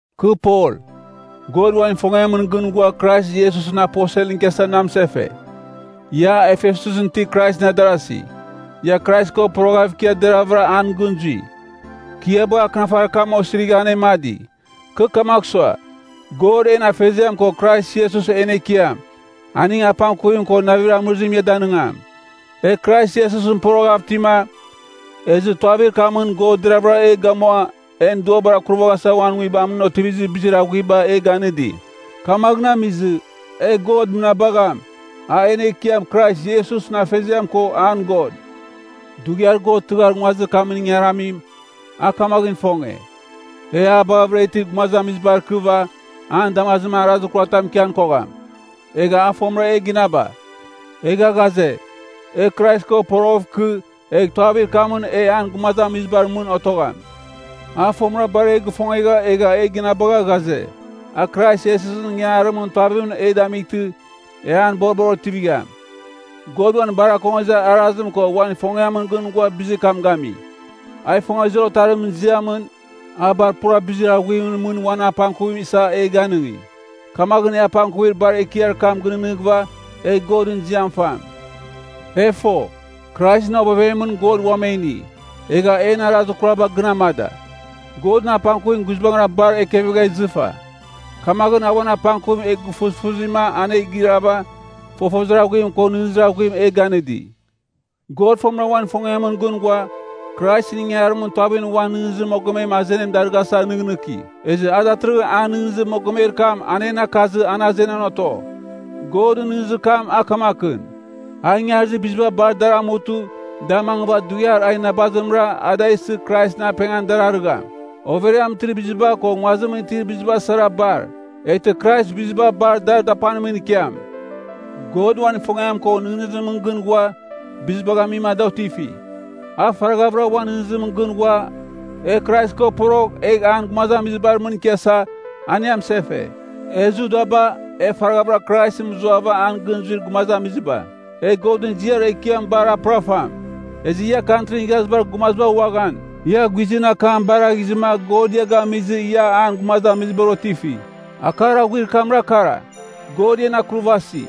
Kɨ Pol, God uan ifongiamɨn gɨn ghua Krais Iesusɨn aposelɨn ikiasa na mɨsefe. Ia, Efesusɨn itir Kraisɨn adarasi, ia Krais ko poroghava ikia deraghavɨra an gɨn zui. Kɨ ia bagha akɨnafarir kam osirigha anemadi. Kɨ kamagh sua, God en Afeziam ko Krais Iesus en Ekiam, aning apangkuvim ko navir amɨrizim ia danɨngam. E Krais Iesusɨn poroghav itima, ezɨ tuavir kamɨn God deravɨra e gamua en duabar akurvaghasa uan Nguibamɨn otivir bizir aghuiba e ganɨdi. Kamaghɨn amizɨ, e God mɨnabagham, a en Ekiam Krais Iesusɨn Afeziam ko an God. Dughiar God tɨghar nguazir kamɨn ingaramim, a kamaghɨn ifonge, e a baghɨvɨra itir gumazamizibar ikɨva, an damazimɨn arazir kuratam ikian kogham, egha a fomɨra e ginaba. Egha ghaze, e Krais ko poroghɨv ikɨ, egh tuavir kamɨn e an gumazamizibar mɨn otogham. A fomɨra bar e gifongegha egha e ginabagha ghaze, a Krais Iesusɨn ingangarimɨn tuavimɨn e damightɨ, e an boribar otivigham. God uan bar akongezir arazim ko uan ifongiamɨn gɨn ghua bizir kam gami. A ifongezir Otarimɨn ziamɨn, a bar pura bizir aghuimɨn mɨn uan apangkuvim isa e ganɨngi. Kamaghɨn e apangkuvir bar ekiar kam gɨnɨghnɨghɨva, egh Godɨn ziam fam. E fo, Kraisɨn ovevemɨn God uam e ini, egha en arazir kuraba gɨn amada. Godɨn apangkuvim guizbangɨra bar ekevegha izɨfa. Kamaghɨn a uan apangkuvim e gufusfuzima an e girava, fofozir aghuim ko nɨghnɨzir aghuim e ganɨdi. God fomɨra uan ifongiamɨn gɨn ghua, Kraisɨn ingangarimɨn tuavimɨn uan nɨghnɨzir mogomem azenim darɨghasa nɨghnɨki. Ezɨ a datɨrɨghɨn an nɨghnɨzir mogomer kam a en akazɨ an azenan oto. Godɨn nɨghnɨzir kam a kamakɨn, a ingarizir biziba bar dar amutɨ da mangɨva dughiar a inabazimɨra a da isɨ Kraisɨn apengan dar arɨgham. Overiamɨn itir biziba ko nguazimɨn itir biziba sara bar. Eghtɨ Krais biziba bar dar dapanimɨn ikiam. God uan ifongiam ko nɨghnɨzimɨn gɨn ghua, bizibagh amima da otifi. A faraghavɨra uan nɨghnɨzimɨn gɨn ghua, e Krais ko porogh egh an gumazamizibar mɨn ikiasa, an e amɨsefe. E Judaba, e faraghavɨra Krais mɨzuava an gɨn zuir gumazamiziba, e Godɨn ziar ekiam bar a pɨrafam. Ezɨ ia Kantrin Igharazibar Gumaziba uaghan, ia guizɨn akam baraghizɨma God ia gamizɨ ia an gumazamizibar otifi. Akar aghuir kamra kara: God ian akurvasi.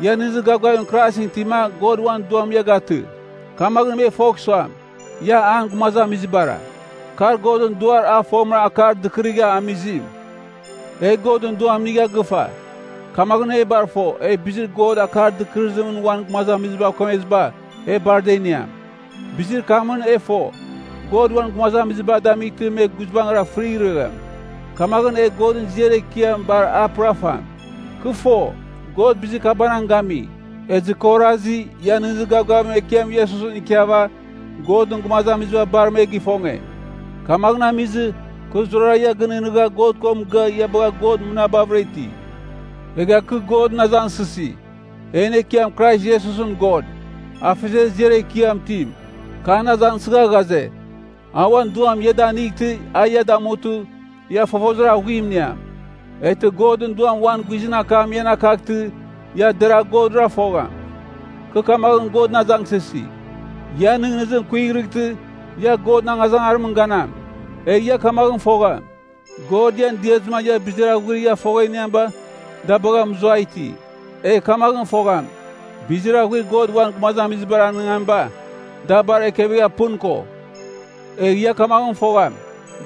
Ia nɨghnɨzir gavgavim Kraisɨn itima God uan Duam ia gatɨ. Kamaghɨn me fogh suam, ia an gumazamizibara. Kar Godɨn Duar a fomɨra akar dɨkɨrigha amizim. E Godɨn Duam inigha gɨfa, kamaghɨn e bar fo, e bizir God akar dɨkɨrɨzimɨn uan gumazamizibav kemeziba, e bar da iniam. Bizir kamɨn e fo, God uan gumazamiziba damightɨ me guizbangɨra fɨrighregham. Kamaghɨn e Godɨn ziar ekiam bar a pɨrafam. Kɨ fo, God bizir kabanang gami, ezɨ kɨ orasi, ia nɨghnɨzir gavgavim Ekiam Iesusɨn ikiava, Godɨn gumazamiziba bar me gifonge, kamaghɨn amizɨ, kɨ zurara ia gɨnɨghnɨgha God ko mɨgɨa ia bagha God mɨnabavɨra iti. Egha kɨ Godɨn azangsɨsi, en Ekiam Krais Iesusɨn God, Afeziar ziar ekiam itim, kɨ an azangsɨgha ghaze, a uan Duam ia danightɨ a ia damutɨ, ia fofozir aghuim iniam. Eghtɨ Godɨn Duam uan guizɨn akam ian akaghtɨ, ia deragh Godra fogham. Kɨ kamaghɨn Godɨn azangsɨsi, ian nɨghnɨzim kuighrɨghtɨ ia Godɨn angazangarimɨn ganam. Egh ia kamaghɨn fogham, God ian diazɨma ia bizir aghuir ia fogha iniamiba da bagha mɨzuai iti. Egh kamaghɨn fogham, bizir aghuir God uan gumazamizibar anɨngamiba, da bar ekevegha pɨn ko. Egh ia kamaghɨn fogham,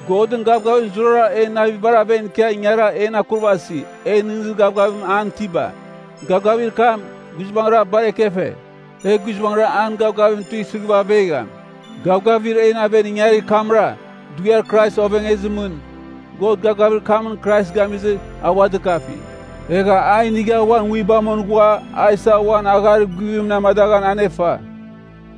Godɨn gavgavim zurara en navibar aven ikia ingara en akurvasi, e nɨghnɨzir gavgavim an itiba. Gavgavir kam, guizbangɨra bar ekefe, e guizbangɨra an gavgavim tuisɨva avegham. Gavgavir en aven ingarir kamra, dughiar Krais ovengezimɨn, God gavgavir kamɨn Krais gamizɨ, a ua dɨkafi. Egha a inigha uan Nguibamɨn ghua a isa uan agharir guvimɨn amadaghan anefa.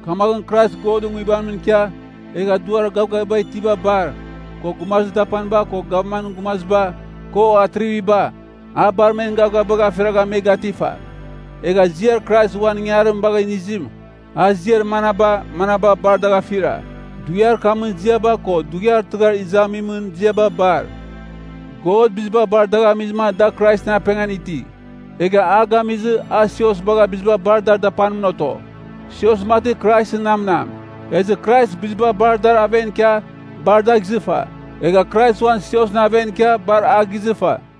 Kamaghɨn Krais Godɨn Nguibamɨn ikia egha duar gavgaviba itiba bar, ko gumazir dapaniba, ko gavmanɨn gumaziba, ko atriviba, a bar men gavgavibagh afiragha me gatifa. Egha Ziar Krais uan ingangarim bagha inizim a ziar manaba, manaba bar dagh afira, dughiar kamɨn ziaba ko dughiar tɨghar izamimɨn ziaba bar. God biziba bar dagh amizɨma da Kraisɨn apengan iti. Egha a gamizɨ, a sios bagha biziba bar dar dapanimɨn oto. Sios mati Kraisɨn namnam. Ezɨ Krais biziba bar dar aven ikia bar dagh izɨfa. Egha Krais uan siosɨn aven ikia bar a gizɨfa.